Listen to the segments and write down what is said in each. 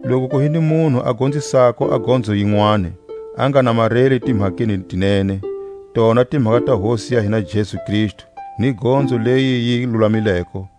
Loku ku hi ni munhu a gonzisako a gonzo yinwani, a nga namareli timhakeni ti nene, tona timhaka ta Hosi ya hina Jesu Kristu, ni gonzo leyi yi lulamileko,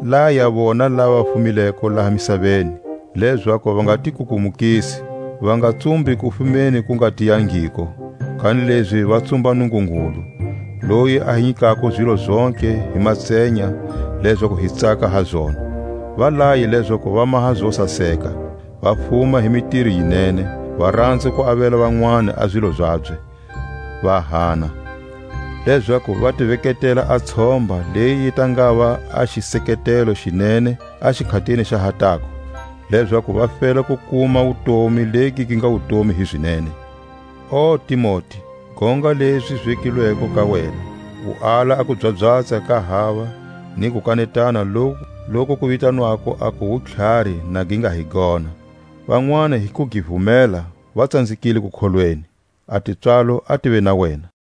Laya vona lava va fumileko laha misaveni, lezaku va nga ti kukumukisi, va nga tsumbi kufumeni ku nga tiyangiko, kanilezi va tsumba Nungungulu, loyi a hi nyikako zilo zontlhe hi matsenya lezaku hi tsaka ha zona. Va laye lezaku va maha zo saseka, va fuma hi mitiro yi nene, va ranza ku avela vanwani a zilo zabye, va hana; lezaku va ti veketela a tshomba leyi yi ta ngava a xiseketelo xi nene a xikhatini xa ha tako, lezaku va fela ku kuma wutomi legi gi nga wutomi hizinene. O Timote, gonga lezi zi vekilweko ka wena, u ala a kubyabyatsa ka hava ni kukanetana loku ku vitanwako aku wutlhari na gi nga hi gona; Vanwani hi ku gi vumela va tsanzekile kukholweni. A tipswalo a tive na wena!